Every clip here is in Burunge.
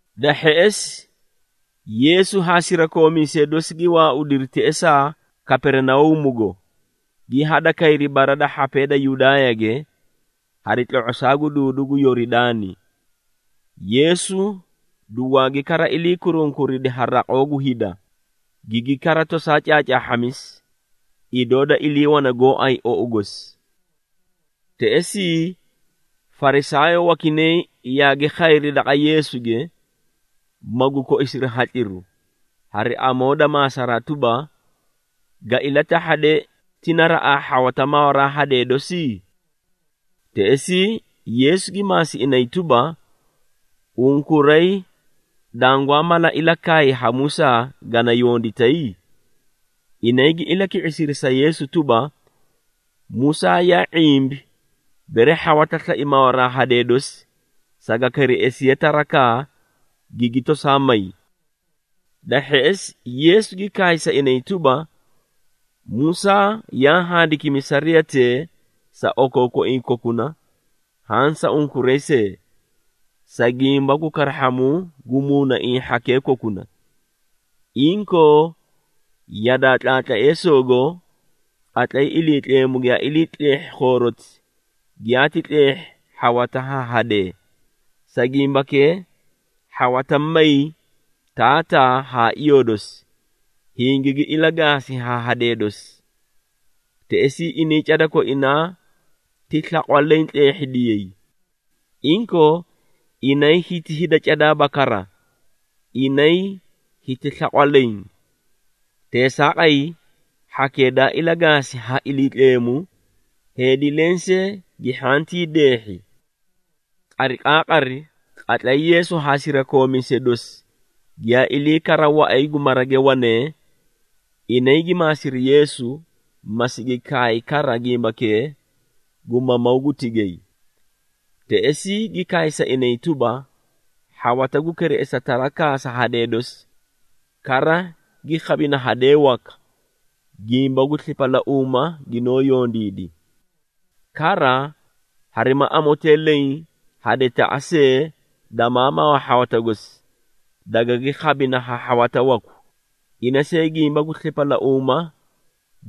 Da hheꞌesi Yeesu haa sirakoomiisee dosi gi waaudiri teꞌesaa Kaperinauumugo, gi hadakayri bara da hhapee da Yudaayage, hari tlo⁄osaa gu duudu gu Yoridaani. Yeesu dugwaagi kara ilii kurunkuridi ha raqoo gu hida, gigi kara tosaa caacaahhamisi, idoo daa iliiwane gooay ou gosi. Teꞌesii Farisaayoo wakinay yaagi khayri daqa Yeesuge, magu koisiri hatliru, hari amoo da maasaraa tuba, “Ga ilatahhade, ti naraꞌaa hhawata mawaraa hadee dosi?” Teꞌesii Yeesu gi maasi inay tuba, “Unkuray dangwaa mala ilakaay ha Musaa, gana yonditay?” Inay gi ilaki⁄isiri sa Yeesu tuba, “Musaa yaa ⁄imbi, bere hhawata slai mawaraa hadee dosi, saga kereꞌesiye tarakaa, gigi tosaa may.” Da hheꞌesi Yeesu gi kaay sa inay tuba, “Musaa yaa handikimi sariyatee sa okookoiĩ kokuna haã sa unkuray see, sa gimba gu karahhamuu gu muunaiĩ hhakee kokuna. Inkoo yadaa tlaatleesoogo, qatlay Iliitleemu giyaa ilii tleehhi khooroti, ‘giyaati tleehhi hhawata haa hadee.’ ‘Sa gimbakee, hhawata may taataa haa iyoo dosi, hingigi ilagaasi haa hadee dosi. Teꞌesii inay cada koinaa gi slaqwa leẽ tleehhidiyay.’ Inkoo, inay hiti hida cadaaba kara, inay hiti slaqwa leẽ. Teesaaqay, hhakee daa ilagaasi ha Iliitleemu, heedi lensee gi hhantii deehhi.” Qariqaaqari, qatlay Yeesu haa sirakoomiisee dosi giyaa ilii kara waꞌay gu marage wanee, inay gi maasiri Yeesu, ma sigi kaay kara gimbakee gu mamawuu gu tigay. Teꞌesii gi kaay sa inay tuba, “Hhawata gu kereꞌesa tarakaa sa hadee dosi, kara gi khabina hadee waka, gimba gu slipalauuma ginoo yondiidi. Kara harima amotee leẽ hadetaꞌa see damaa mawa hhawata gosi, dagagi khabina ha hhawata waku, ina see gimba gu slipalauuma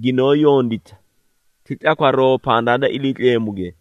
ginoo yondita, ti tlakwaroo pandaa da Iliitleemuge.”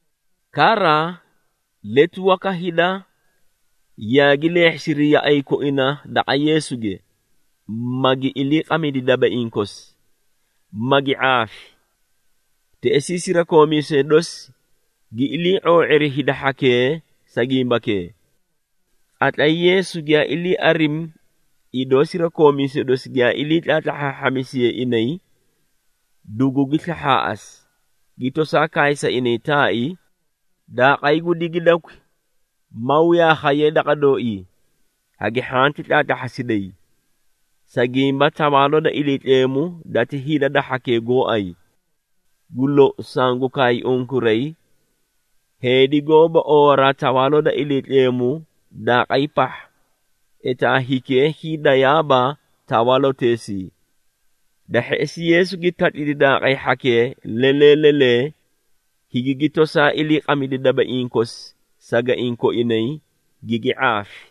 Kara letu waka hida yaagi leehhisiri yaꞌay koina daqa Yeesuge, magi iliiqamidi dabaiĩ kosi, magi ⁄aafi. Teꞌesii sirakoomiisee dosi gi ilii ⁄oo⁄iri hida hhakee sa gimbakee. Qatlay Yeesu giyaa ilii arimi idoo sirakoomiisee dosi giyaa ilii tlahhaahhamisiyee inay, dugugi slahhaaꞌasi, gi tosaa kaay sa inay taai, “Daaqay gu digidakwi maw yaa khayee daqa dooii, hagi hhanti tlaatlahhasiday. Sa gimba Tawaaloo da Iliitleemu dati hida da hhakee gooay. Gu lou, sangu kaay unkuray, heedi goóba oowaraa Tawaaloo da Iliitleemu daaqay pahha, etaa hikee hiidayaaba tawaaloteesii.” Da hheꞌesi Yeesu gi tatlidi daaqay hhakee lelee lelee, higigi tosaa iliiqamidi dabaiĩ kosi sagaiĩ koinay, gigi ⁄aafi.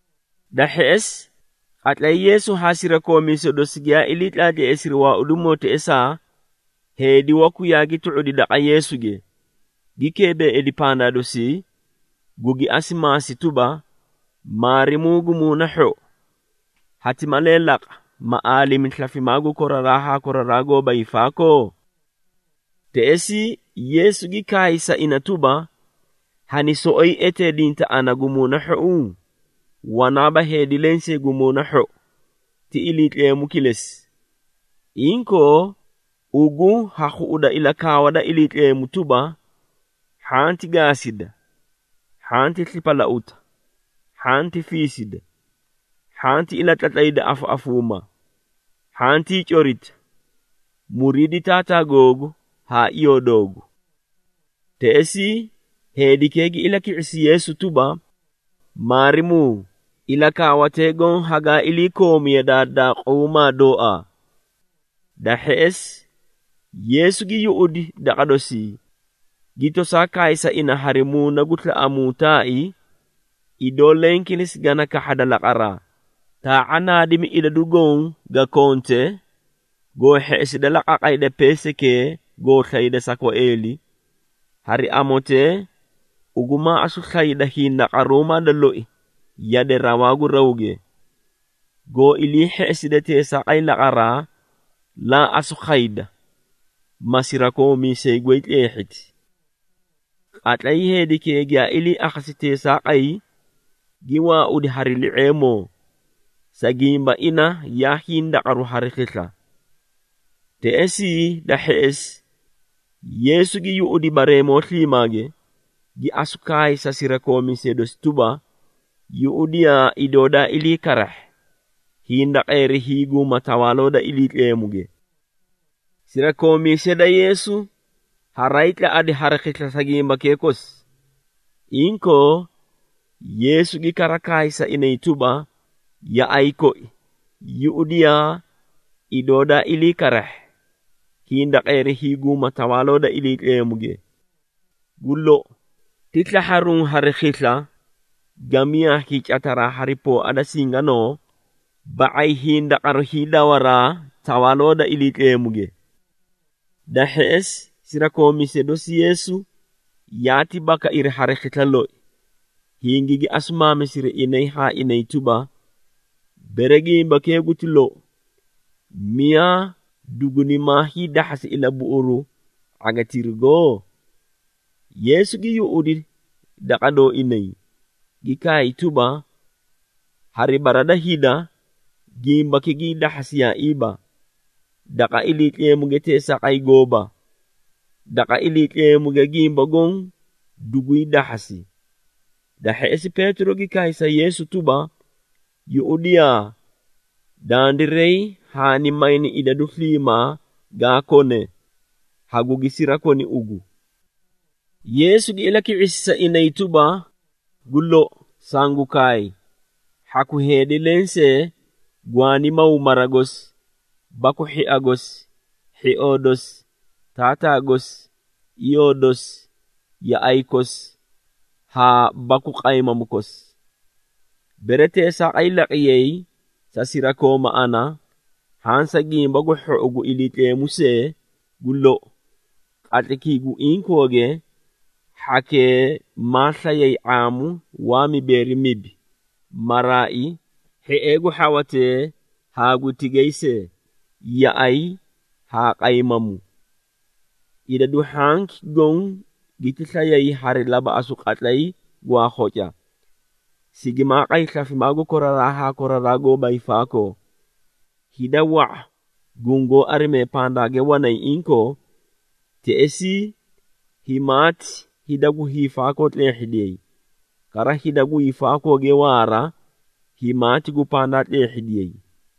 Da hheꞌesi, qatlay Yeesu haa sirakoomiisee dosi giyaa ilii tlaatleesiri waaudimoo teꞌesaa, heedi waku yaagi tu⁄udi daqa Yeesuge, gi keebeeidi pandaa dosii, gugi asu maasi tuba, “Maarimuu gu muuna hhou, hati malee laqa, ma aalimi slafimaa gu koraraa haa koraraa goóba hiifaakoo?” Teꞌesii Yeesu gi kaay sa ina tuba, “Hani soꞌoyi eteedinta ana gu muuna hhou? Wanaaba heedi lensee gu muuna hhou, ti Iliitleemu kilesi. Inkoo, ugu ha khuꞌuda ilakaawa da Iliitleemu tuba, ‘Hhanti gaasida, hhanti slipalauta, hhanti fiisida, hhanti ilatlatlayda afaꞌafuuma, hhantii corita, muriidi taataa googu haa iyoo doogu.’” Teꞌesii heedikee gi ilaki⁄isi Yeesu tuba, “Maarimuu, ilakaawatee goõ hagaa iliikoomi yadaa daaquumaa dooaa.” Da hheꞌesi Yeesu gi yuꞌudi daqa dosii, gi tosaa kaay sa ina hari muuna gu slaꞌamuu taai, “Idoo leẽ kilesi gana kahhada laqaraa, taa⁄a naadimi idadu goõ ga konte, goo hheꞌeside la qaqayda peesaykee goo slayde sa kwaeeli, hari amotee ugu maa asu slayda hindaqaruumaa da loi yade rawaa gu rawge. Goo ilii hheꞌeside teesaaqay laqaraa, laa asu khayda, ma sirakoomiisay goy tleehhiti.” Qatlay heedikee giyaa ilii akhasi teesaaqay, gi waaudi hari li⁄eemoo, sa gimba ina yaa hindaqaru hari khisla. Teꞌesii da hheꞌesi Yeesu gi yuꞌudi bareemoo sliimaage, gi asu kaay sa sirakoomiisee dosi tuba, “Yuꞌudiyaa idoo daa ilii karahhi, hindaqeeri hiiguuma Tawaaloo da Iliitleemuge!” Sirakoomiisee da Yeesu haraay tlaꞌadi hari khisla sa gimbakee kosi. Inkoo Yeesu gi kara kaay sa inay tuba, “Yaꞌay koi, yuꞌudiyaa idoo daa ilii karahhi, hindaqeeri hiiguuma Tawaaloo da Iliitleemuge! Gu lou, ti slahharuũ hari khisla, gamiyaa hiicataraa hari pooa da singanoo, ba⁄ay hindaqaru hiidawaraa Tawaaloo da Iliitleemuge.” Da hheꞌesi sirakoomiisee dosi Yeesu yaati bakairi hari khisla loi, hingigi asu maamisiri inay haa inay tuba, “Bere gimbakee guti lou, miyaa dugunimaa hiidahhasi ilabuꞌuru ⁄agitirugo?” Yeesu gi yuꞌudi daqa dooinay, gi kaay tuba, “Hari bara da hida, gimbaki gii dahhasiyaaiiba, daqa Iliitleemuge teesaaqay gooba. Daqa Iliitleemuge gimba goõ dugwii dahhasi.” Da hheꞌesi Peetiro gi kaay sa Yeesu tuba, “Yuꞌudiyaa, dandiray haani mayni idadu sliimaa gaa kone, hagugi sirakoni ugu.” Yeesu gi ilaki⁄isi sa inay tuba, “Gu lou, sangu kaay, hhaku heedi lensee gwaani maw mara gosi baku hhia gosi, hhioo dosi, taataa gosi, iyoo dosi, yaꞌay kosi, haa baku qaymamu kosi. Bere teesaaqay laqiyay sa sirakooma ana haã sa Gimba gu Hhou gu Iliitleemu see, gu lou, qatlaykii gu inkooge hhakee maa slayay ⁄aamu waa mibeeri mibi, maraai, hhiee gu hhawatee haa gu tigay see, yaꞌay haa qaymamu. Idadu hhanki goõ giti slayay hari labaꞌasu qatlay gwaa khoca, sigimaa qay slafimaa gu koraraa haa koraraa goóba hiifaakoo. Hida wa⁄a gungoó arimee pandaage wanay inkoo, teꞌesii himaati hida gu hiifaakoo tleehhidiyay, kara hida gu hiifaakooge waara, himaati gu pandaa tleehhidiyay.”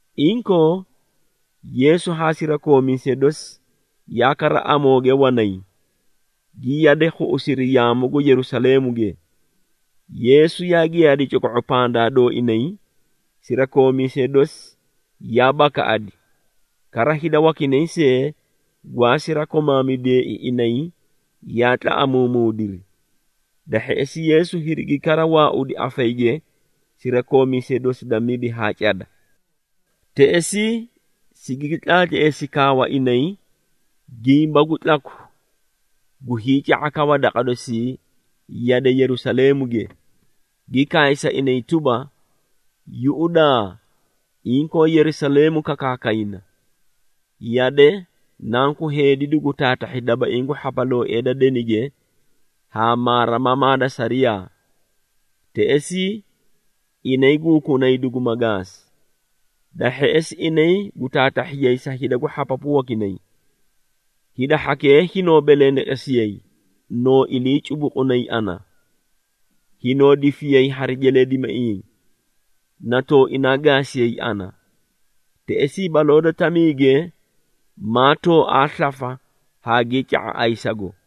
Inkoo Yeesu haa sirakoomiisee dosi yaa kara amooge wanay, gi yade khuꞌusiri yaamu gu Yerusaleemuge. Yeesu yaa giyaadi coko⁄o pandaa dooinay, sirakoomiisee dosi yaa bakaꞌadi, kara hida wakinay see gwaa sirakomaamidiyeei inay yaa tlaꞌamuumuudiri. Da hheꞌesi Yeesu hirigi kara waaudi afayige sirakoomiisee dosi da mibi haa cada. Teꞌesii sigigi tlaatleesi kaawa inay, gimba gu tlaku gu hiica⁄akawa daqa dosii yade Yerusaleemuge, gi kaay sa inay tuba, “Yuꞌudaa, inkoo Yerusaleemu kakaakayna. Yade, Nanku Heedi dugu taatahhi dabaiĩ gu hhapalooee da denige haa maarimamaa da sariyaa. Teꞌesii, inay gu hukunay duguma gaasi. Da hheꞌesi, inay gu taatahhiyay sa hida gu hhapapu wakinay. Hida hhakee hinoo belendeqesiyay, noo ilii cubuqunay ana, hinoo difiyay hari jeleedimaiĩ na tooinaa gaasiyay ana. Teꞌesii baloo da tamiige maa tooaa slafa haagii ca⁄a ayisago.”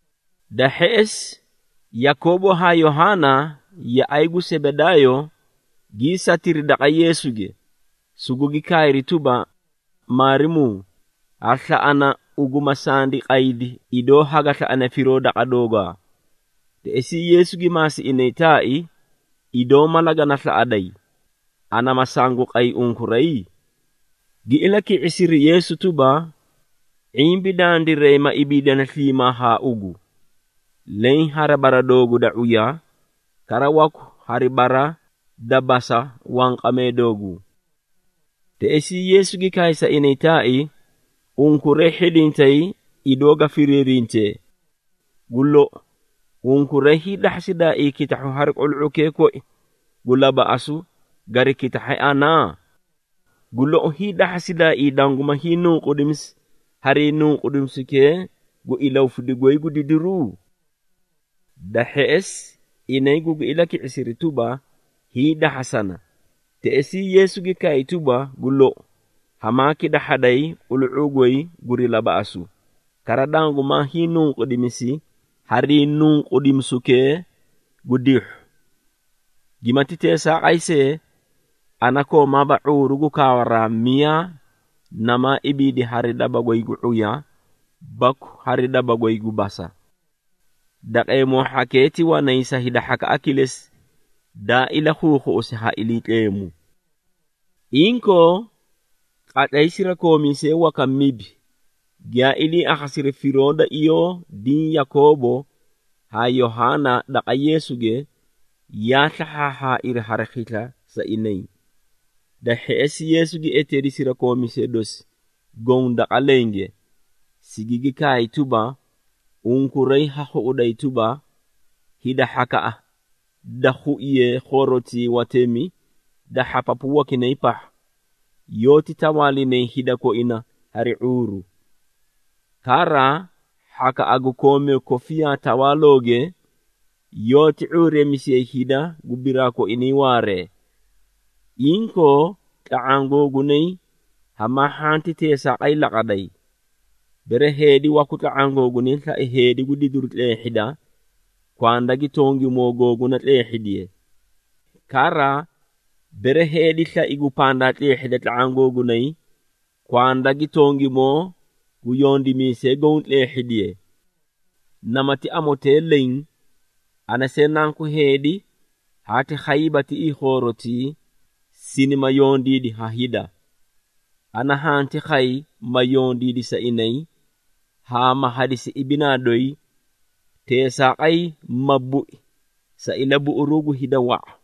Da hheꞌesi Yakoobo haa Yohaana, yaꞌay gu Sebedaayo, gii satiri daqa Yeesuge, sugugi kaayri tuba, “Maarimuu, ha slaꞌana, ugu ma sandi qaydi idoo haga slaꞌane firoo daqa doogaa.” Teꞌesii Yeesu gi maasi inay taai, “Idoo mala gana slaꞌaday, ana ma sangu qay unkuray?” Gi ilaki⁄isiri Yeesu tuba, “⁄imbi dandiray ma ibiidani sliimaa haa ugu, leẽ hari bara doogu da ⁄uya, kara waku hari bara da basa wanqamee dooguu.” Teꞌesii Yeesu gi kaay sa inay taai, “Unkuray hhidintay idoo ga firiirintee! Gu lou, unkuray hiidahhasidaaii kitahhu hari qulu⁄ukee koi gu labaꞌasu gari kitahhe ana? Gu lou, hiidahhasidaaii danguma hiinunqudimisi harii nunqudimisukee gu ilahufidu goy gu didiru?” Da hheꞌesi inay gugi ilaki⁄isiri tuba, “Hiidahhasana!” Teꞌesii Yeesu gi kaay tuba, “Gu lou, hamaa kitahhaday qulu⁄uu goy guri labaꞌasu, kara dangumaa hiinunqudimisi harii nunqudimisukee gu dihhu. Gimati teesaaqay see, ana koomaaba ⁄uuru gu kaawaraa miyaa namaa ibiidi hari daba goy gu ⁄uya baku hari daba goy gu basa. Daqeemoo hhakee ti wanay sa hida hhakaꞌa kilesi, daa ilakhuukhuꞌusi ha Iliitleemu.” Inkoo qatlay sirakoomiisee waka mibi giyaa ilii akhasiri firoo da iyoo diĩ Yakoobo haa Yohaana daqa Yeesuge, yaa slahhaahhaairi hari khisla sa inay. Da hheꞌesi Yeesu gi eteedi sirakoomiisee dosi goõ daqa lenge, sigigi kaay tuba, “Unkuray ha khuꞌuday tuba, hida hhakaꞌa da khuiye khoorotii watemi da hhapapu wakinay pahha, yoóti tawaalinay hida koina hari ⁄uuru. Kara, hhakaꞌa gu koomee kofiyaa tawaalooge, yoóti ⁄uureemisiyay hida gu biraa koinay waaree. Inkoo tla⁄aã googunay hamaa hhanti teesaaqay laqaday. Bere heedi waku tla⁄aã googunay slai heedi gu didiru tleehhida, kwanda gi tongimoo googuna tleehhidiye. Kara, bere heedi slai gu pandaa tleehhida tla⁄aã googunay, kwanda gi tongimoo gu yondimiisee goõ tleehhidiye. Namati amotee leẽ, ana see Nanku Heedi haati khayiiba tiꞌii khoorotii, sinima yondiidi ha hida. Ana hanti khay, ma yondiidi sa inay, haa ma hadisi ibinaa doyi, teesaaqay ma bui sa ilabuꞌuruu gu hida wa⁄a.”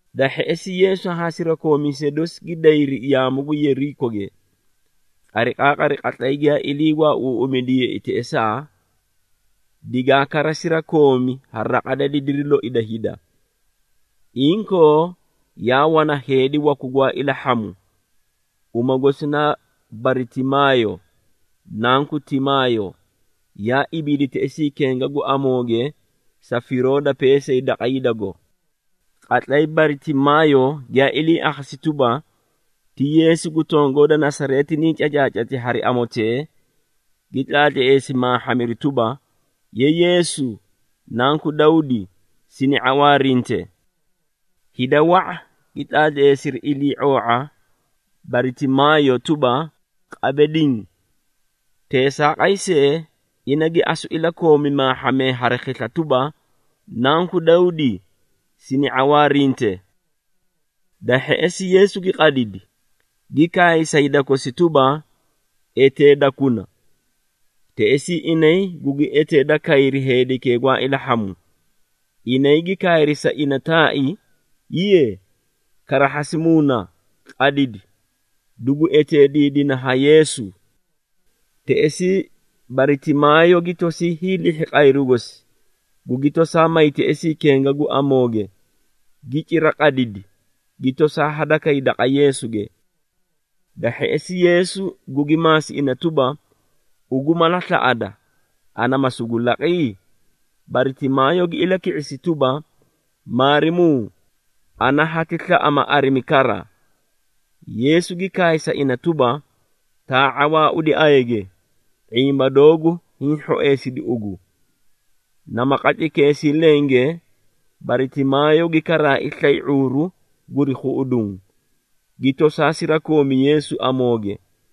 Da hheꞌesi Yeesu haa sirakoomiisee dosi gi dayri yaamu gu Yeerikoge. Qariqaaqari, qatlay giyaa ilii waauuꞌumidiyeei teꞌesaa, digaa kara sirakoomi ha raqa da didiri loi da hida. Inkoo yaa wana heedi waku gwaa ilahhamu, uma gosi naa Baritimaayo, nanku Timaayo, yaa ibiidi teꞌesii kenga gu amooge sa firoo da peesay daqa hidago. Qatlay Baritimaayo giyaa ilii akhasi tuba, ti Yeesu gu tongoo da Nasareeti nii cacaacati hari amotee, gi tlaatleesi maahhamiru tuba, “Ye Yeesu, Nanku Dawdi, sini ⁄awaarinte!” Hida wa⁄a gi tlaatleesiri ilii⁄oo⁄a Baritimaayo tuba, qabe diĩ! Teesaaqay see, ina gi asu ilakoomi maahhamee hari khisla tuba, “Nanku Dawdi, sini ⁄awaarinte!” Da hheꞌesi Yeesu gi qadidi, gi kaay sa hida kosi tuba, “Eteedakuna!” Teꞌesii inay gugi eteeda kayri heedikee gwaa ilahhamu, inay gi kaayri sa ina taai, “Hiiye, karahhasi muuna, qadidi, dugu eteediidina ha Yeesu!” Teꞌesii Baritimaayo gi tosii hiilihhi qayru gosi, gugi tosaa may teꞌesii kenga gu amooge, gi cira qadidi, gi tosaa hadakay daqa Yeesuge. Da hheꞌesi Yeesu gugi maasi ina tuba, “Ugu mala slaꞌada, ana ma sugu laqi?” Baritimaayo gi ilaki⁄isi tuba, “Maarimuu, ana hati slaꞌa ma arimi kara.” Yeesu gi kaay sa ina tuba, “Taa⁄a waaudi ayage, ⁄imba doogu hiĩ hhoeesidi ugu.” Nama qatlaykeesii lenge Baritimaayo gi karaai slay ⁄uuru guri khuꞌuduũ, gi tosaa sirakoomi Yeesu amooge.